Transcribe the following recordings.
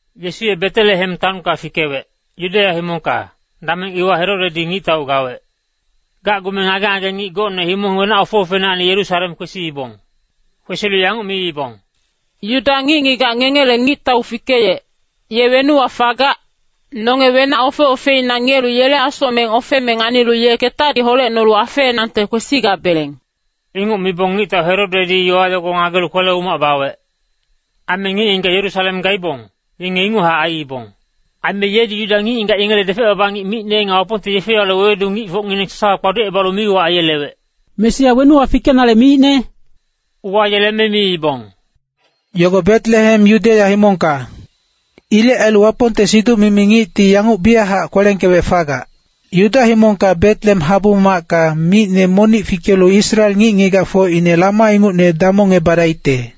Yesu ye Betelehem taonka fikewec, Yudeya himongka, dameng iwa Herodedi ngictau gawec. Gacgume ngage-ngage ngic gocne himong wenac ofe-ofeinacni Yerusalem kwesiibong. Kwesilu yanguc miibong, “Yuda ngic-ngigac ngengele ngictau fikeyec, ye wenuwa fagac? Nonge wenac ofe-ofeina ngiyelu yele asocmeng ofeme nganilu ye ketadi holecnolu afeenangte kwesigabeleng.” Inguc mibong ngictau Herodedi yowa yogo ngagelu kwele-umac bawec. Aime ngic-ngigac Yerusalem gaibong, yenge inguchac aiibong. Aime yedi Yuda ngic-ngigac yengele depec-baba ngic micne nga Wapongte yefe-yowale wewedu ngicfocngineng sasawa kpaducebalu mi-uwac aiyelewec, “Mesia wenuwa fikenale miicne?” Uwayeleme miibong, “Yogo Betelehem Yudeya himongka. Ilec ailu Wapongte siduc-mimi ngicti yanguc biyachac kwelengkewec fagac, ‘Yuda himongka Betelehem habu-macka micne monic fikelu Israel ngic-ngigacfocine lama ingucne damongebadaicte.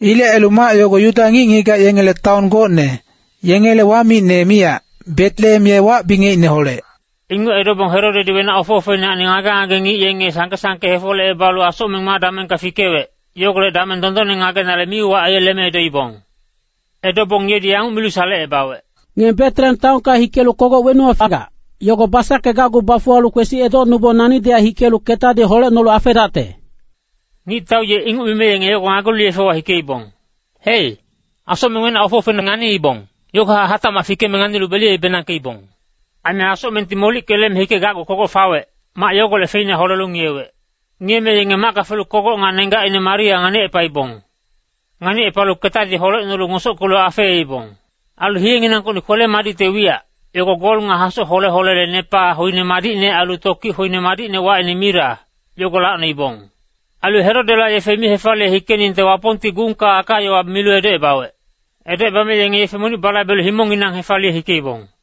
Ilec ailu mac yogo Yuda ngic-ngigac yengele taon gocne, yengele wamicne miyac, Betelehem ye wac-bingecineholec.’” Inguc edobong Herodedi wenac ofe-ofeinacni ngage-ngage ngic yenge sangke-sangke hefolecebalu asocmeng ma damengka fikewec, yogolec dameng dondonne ngagenale mi-uwac aiyeleme edoibong. Edobong yedi yanguc milu salecebawec, “Ngenge Betelehem taonka hikelu kogoc wenuwa fagac, yogo basackegacgu bafuwalu kwesi edocnubong nanidihac hikelu ketadi holecnolu afeedacte.” Ngictau ye inguc mime yenge yogo ngagelu yefewa hikeibong. Hei, asocmeng wenac ofe-ofeina nganiibong, yogohac hatacmac fikeme nganilu beliyebenangkeibong. Aime asocmengti molickeyeleme hikegacgu kogoc fawec, mac yogolec feina holelu ngiyewec. Ngiyeme yenge macka felu kogoc nga nenggacine Maria nganicepaibong. Nganicepalu ketadi holecnolu ngosockelu afeeibong. Ailu hiyenginangkocni kwele-madicte wiyac, yogo gol nga hasoc hole-holele nepa hoine madicne ailu tokic hoine madicne wacine mira, yogo lacnoibong. Ailu Herodela yefe mi hefaliye hikeningte Wapongti gungka aka-yowa milu edocebawec. Edocebame yenge yefe monic balaibelu himongnginang hefaliye hikeibong.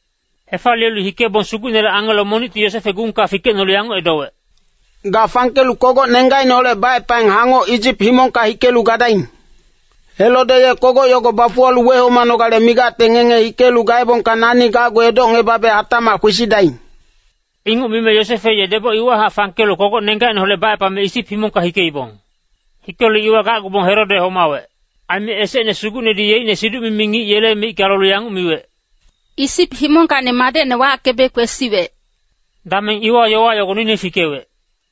Hefaliyelu hikebong Sugucnele angelo monicti Yosefe gungka fikecnolu yanguc edowec, “Ga fangkelu kogoc nenggacineholec bacepang hangoc Isip himongka hikelu gadaing. Herode ye kogoc yogo bafuwalu wehomanale migacte ngenge hike gaebongka nani gacgu edocngebabe hatacmac kwesidaing.” Inguc mime Yosefe ye deboc iwahac fangkelu kogoc nenggacineholec bacepame Isip himongka hikeibong. Hikelu iwa gacgubong Herode homawec. Aime esecne Sugucnedi yeicne siduc-mimi ngic yele micka lolu yanguc miwec, “Isip himongkacni madecne wackebe kwesiwec.” Dameng iwa yowa yogo noine fikewec.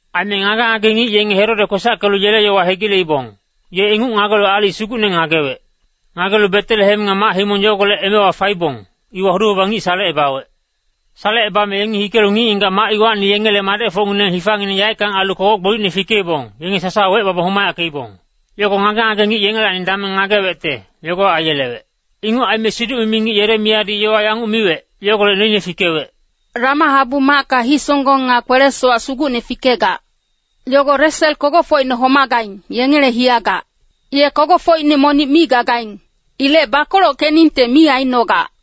Aime ngage-ngage ngic yenge Herode kwesackelu yele yowa hegileibong, ye inguc ngagelu aalic sugucne ngagewec. Ngagelu Betelehem nga mac-himong yogolec emewa faibong, iwa hudu-baba ngic salecebawec. Salecebame yengi hikelu ngic-ngigac mac iwacni yengele madecfocngineng hifangineng yaeckang ailu kogoc gbolicne fikeibong, yenge sasawa wecebabong homayackeibong. Yogo ngage-ngage ngic yengelacni dameng ngagewecte, yogo aiyelewec. Inguc aime siduc-mimi ngic Yeremiyadi yowa yanguc miwec, yogolec noine fikewec. “Rama habu-macka hisonggong nga kwele-sowac sugucne fikegac. Yogo Resel kogocfocine homagaing, yengele hiyagac. Ye kogocfocine monic mi gagaing. Ilec bakolockeningte mi aicnogac.”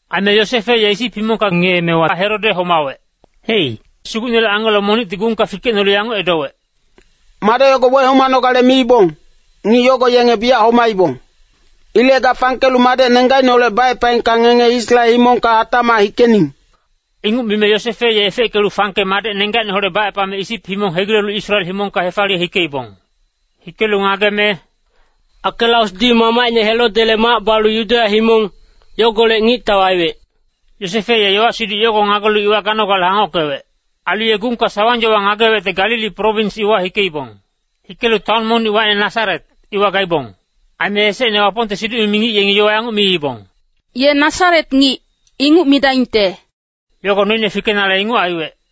Aime Yosefe ye Isip himongka ngiyeemewa Herode homawec. Hei, Sugucnele angelo monicti gungka fikecnolu yanguc edowec, “Madec yogo wehomanogale miibong, ngic yogo yenge biyac homaibong. Ilec ga fangkelu madec nenggacineholec bacepaengka ngenge Israel himongka hatacmac hikening.” Inguc mime Yosefe ye efeckelu fangke madec nenggacineholec bacepame Isip himong hegilelu Israel himongka hefaliye hikeibong. Hikelu ngageme, “Akelaosdi mamacine Herodele mac balu Yudeya himong, yogolec ngictau aiwec.” Yosefe ye yowa-siduc yogo ngagelu iwa ganogale hangockewec. Ailu ye gungka sawang-yowa ngagewecte Galili prowins iwa hikeibong. Hikelu taon monic wacine Nasaret, iwa gaibong. Aime esecne Wapongte siduc-mimi ngic yengi yowa yanguc miibong, “Ye Nasaret ngic, inguc midaingte.” Yogo noine fikenale inguc aiwec.